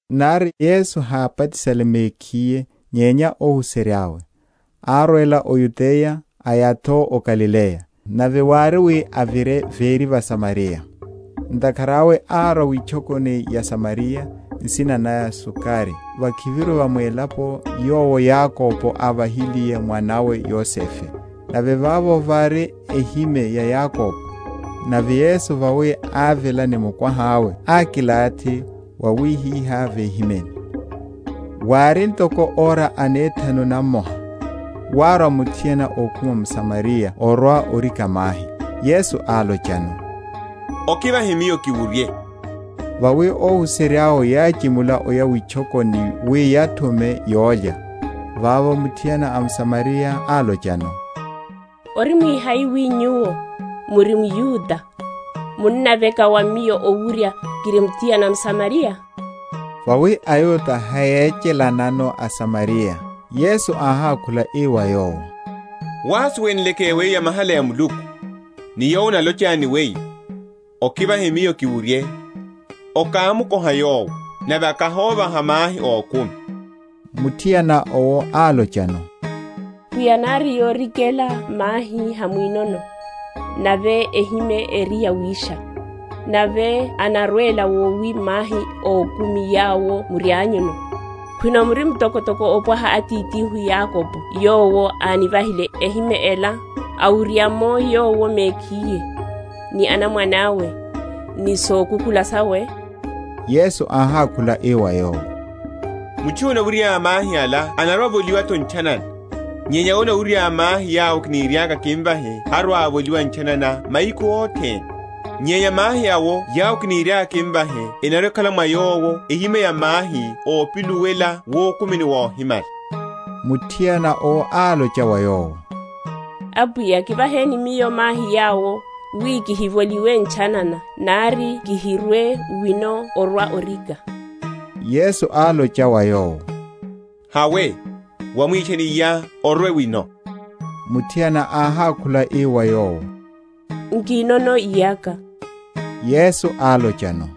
(nari Yesu hábatisale mekhiye nyenya óhuserya’we), árwela o Yudeya, aya’tho o Galileya. Nave wári wi avire véri va Samariya. Ntakhara awe árwa witchokoni ya Samariya, nsina naya Sukari, vakhiviru va mwélapo yowo Yakobo ávahiliye mwana’we Yosefe: nave vavo vári ehime ya Yakobo. Nave Yesu, vawi ávela ni mukwaha’we ákilathi wawihihá vehimeni. Wári ntoko ora anethanu namoha. Wárwa muthiana ókhuma m’Samariya orwa‐orika mahi. Yesu álochano, Okivahe Miyo kiwurye. Vawi óhuserya’we yáchimula oya witchokoni wi yathume yólya. Vavo muthiana a m’Samariya álochano, Orimwi hai wi Nyuwo, muri mYuda, munnaveka wa miyo owurya, kiri muthiana mSamariya? (vawi aYuda hayéchelanano aSamariya). Yesu áhákhula ii wa yowo, Wasuwenleke weyo yamahala ya Muluku, ni Yowo analocha ni weyo, Okivahe miyo kiwurye, okámukoha Yowo, nave akahóvaha mahi ókumi. Muthiana owo álochano, Pwiya nari yorikela mahi hamwinono, nave ehime eri yawisha; nave anarwela wowi mahi ókumi yawo murianyuno? Khwino muri mtokotoko opwaha Atithihu Yakobo yowo ánivahile ehime ela, awurya’mo yowo mekhiye, ni anamwane awe, ni sokukhula sawe? Yesu áhákhula ii wa yowo, Mutchu yowo anawurya mahi ala anarwa‐avoliwa’tho ntchanana; nyenya yowo anarwa‐awurya mahi yawo kiniriaka kimvahe harwa‐avoliwa ntchanana mahiku othene; nyenya mahi awo yawo kiniriaka kimvahe enarwa‐ekhala mwa yowo ehime ya mahi ópiluwela wukumini wohimala. Muthiana owo álocha wa Yowo, Apwiya, kivaheni miyo mahi yawo, wi kihivoliwe ntchanana, nari kihirwe wino orwa‐orika. Yesu álocha wa yowo, Hawe, wamwitchane iyá, orwe wino. Muthiana áhákhula ii wa Yowo, Nkinono iyaka. Yesu álochano,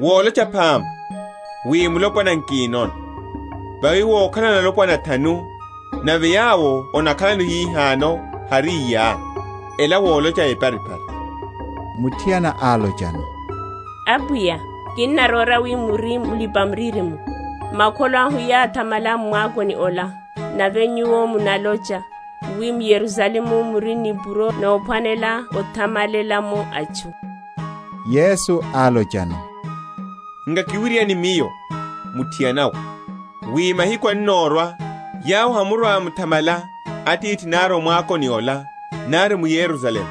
Wolocha phama, wi mulopwana nkinono; vawi wokhalano alopwana athanu; nave yowo onakhaláno hihano hari iyá: ela wolocha eparipari. Muthiana álochano, Apwiya, kinnaróra wi muri Mulipa‐miririmo. Makholo ahu yáthamala m’mwakoni ola; nave nyuwo munalocha, wi m’Yerusalemu muri nipuro nophwanela othamalela’mo atchu. Yesu álochano, Nkakiwiryane Miyo, muthiana we, wi mahiku annorwa, yawo hamurwa‐muthamala Atithi nari m’mwakoni ola, nari m’Yerusalemu.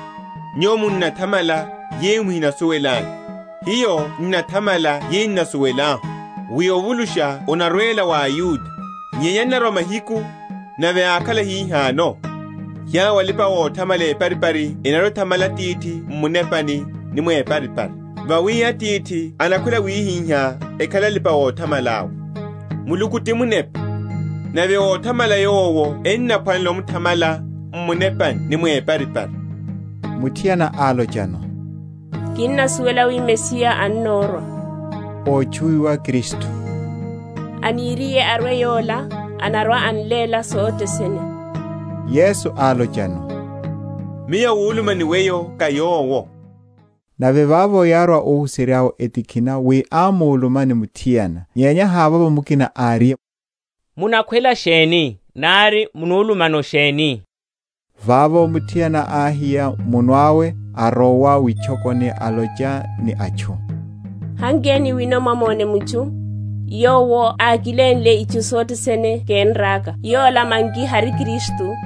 Nyuwo munathamala yeyo muhinasuwelanyu; hiyo n’nathamala yeyo n’nasuwelahu; wi ovulusha onarwela wa aYuda. Nyenya annorwa mahiku, nave ákhala hihano, yawo alipa‐othamala eparipari enarwa‐ethamala Atithi m’munepani ni mwiparipari: vawi Atithi anakhwela awihiha ekhale alipa‐othamala’we. Muluku ti Munepa: nave óthamala Yowo enaphwanela omuthamala m’munepani ni mwiparipari. Muthiana álochano, Kinnasuwela wi Mesiya annorwa (ótchuwiwa Kristu): aniriye arwe yola, anarwa‐an’léla sothe sene. Yesu álochano, Miyo awuluma ni weyo ká Yowo. Nave vavo yárwa óhuserya’we; etikhina wi ámuluma ni muthiana; nyenya havovo mukina áriye, Munakhwela sheni?nari, munulumano sheni? Vavo muthiana áhiya muno awe, arowa witchokoni, alocha ni atchu, Hankeni wino mwamone mutchu, yowo ákilénle itchu sothe sene kénraka: yola manki hari Kristu?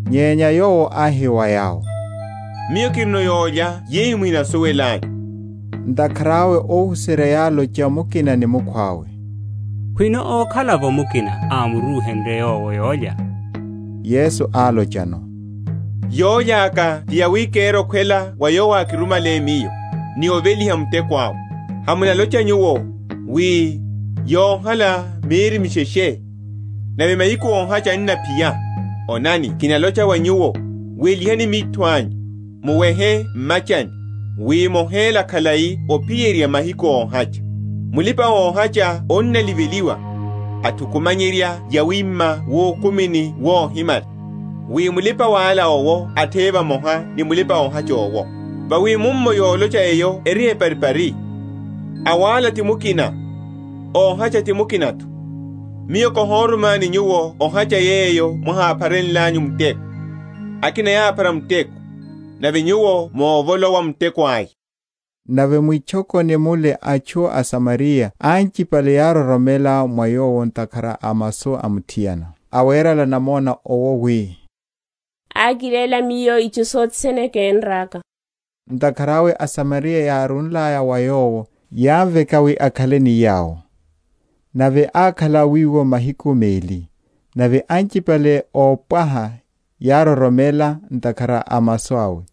Nyenya Yowo áhi wa yawo, Miyo kirino yólya yeyo muhinasuwelanyu. Ntakhara awe óhuserya yálocha mukina ni mukhwawe, Khwino ókhala’vo mukina ámuruhenrye Yowo yólya? Yesu álochano, Yólya aka ti yawi kere okhwela wa Yowo ákirumale Miyo, ni oveliha muteko awe. Hamunalocha nyuwo, wi, Yohala mieri misheshe, nave mahiku óhacha enaphiya? Onani kinalocha wa nyuwo, Welihani mitho anyu, muwehe m’machani, wi mohéla khalai ophiyerya mahiku óhacha. Mulipa‐ohacha annaliveliwa, athukumanyerya yawima wukumini wohimala; wi mulipa‐wala owo atheye vamoha ni mulipa‐ohacha owo. Vawi mummo yolocha eyo eri eparipari, Awala ti mukina, óhacha ti mukina’tho. Miyo káhorumani nyuwo ohacha yeyo mwaháphare?-?nlanyu’vo muteko; akina yáphara muteko, nave nyuwo movolowa muteko aya. Nave mwitchokoni mule atchu aSamariya anchipale yároromela mwa Yowo ntakhara a masu a muthiana, awerela namona owo, wi, Ákiléla miyo itchu sothe sene kénraka. Ntakhara awe aSamariya yárúlaya wa Yowo, yámukoha akhaleno; nave ákhala wiwo mahiku meli. Nave anchipale ópwaha yároromela ntakhara a masu awe: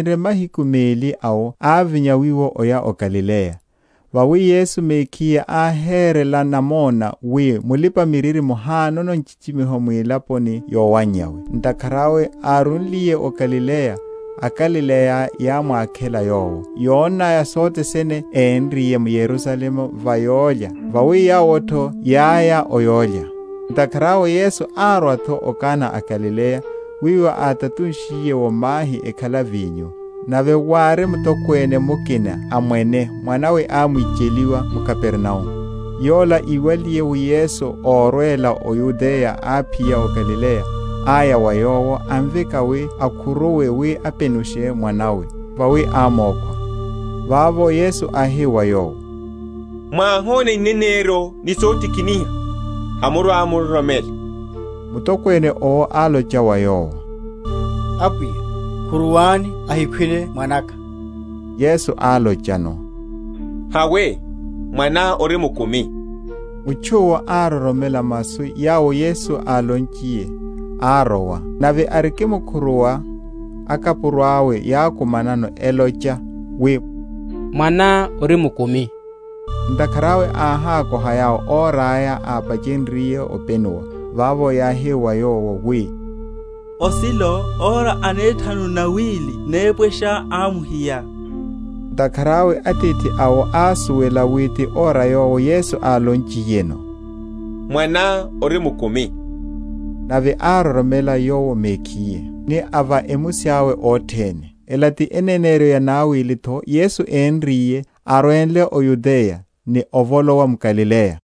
Nyenya vavinre mahiku meli awo ávinya wiwo oya o Galileya. Vawi Yesu mekhiye áherela namona wi, Mulipa‐miririmo hanono nchichimiho mwilaponi yowannyawe. Ntakhara awe árúliye o Galileya, aGalileya yámwakhela Yowo, yonnaya sothe sene énriye m’Yerusalemu va yólya; vawi yawo’tho yáya o yólya. Ntakhara awe Yesu árwa’tho o Kana a Galileya, wiwo átatunshiye’wo mahi okhala vinyo. Nave wári mutokwene mukina a mwene, mwana’we ámwicheliwa m’Kapernaumu. Yola, íwaliye wi Yesu órwela o Yudeya aphiya o Galileya, áya wa Yowo, amveka wi akhuruwe, wi apenushe mwana’we; vawi ámokhwa. Vavo Yesu áhi wa yowo, Mwáhona ineneryo ni sotikiniha, hamurwa‐muroromela. Mutokwene owo álocha wa Yowo, Apwiya, khuruwani ahikhwile mwana’ka. Yesu álochano, Hawe, mwaná ori mukumi. Mutchu’wo ároromela masu yawo Yesu álonchiyeno, arowa. Nave arikimkhuruwa, akapuro awe yákumanano, elocha, wi, Mwaná ori mukumi. Ntakhara awe áhakoha yawo ora aya ápachenryiye openuwa. Vavo yáhi wa yowo, wi, Osilo, ora anethanu nawili nepwesha ámuhiya. Ntakhara awe atithi awo ásuwela wi ti ora yowo Yesu álonchiyeno, Mwaná ori mukumi; nave ároromela yowo mekhiye ni a va emusi awe othene. Ela ti eneneryo yanawili’tho Yesu énriye, arwenle o Yudeya, ni ovolowa m’Galileya.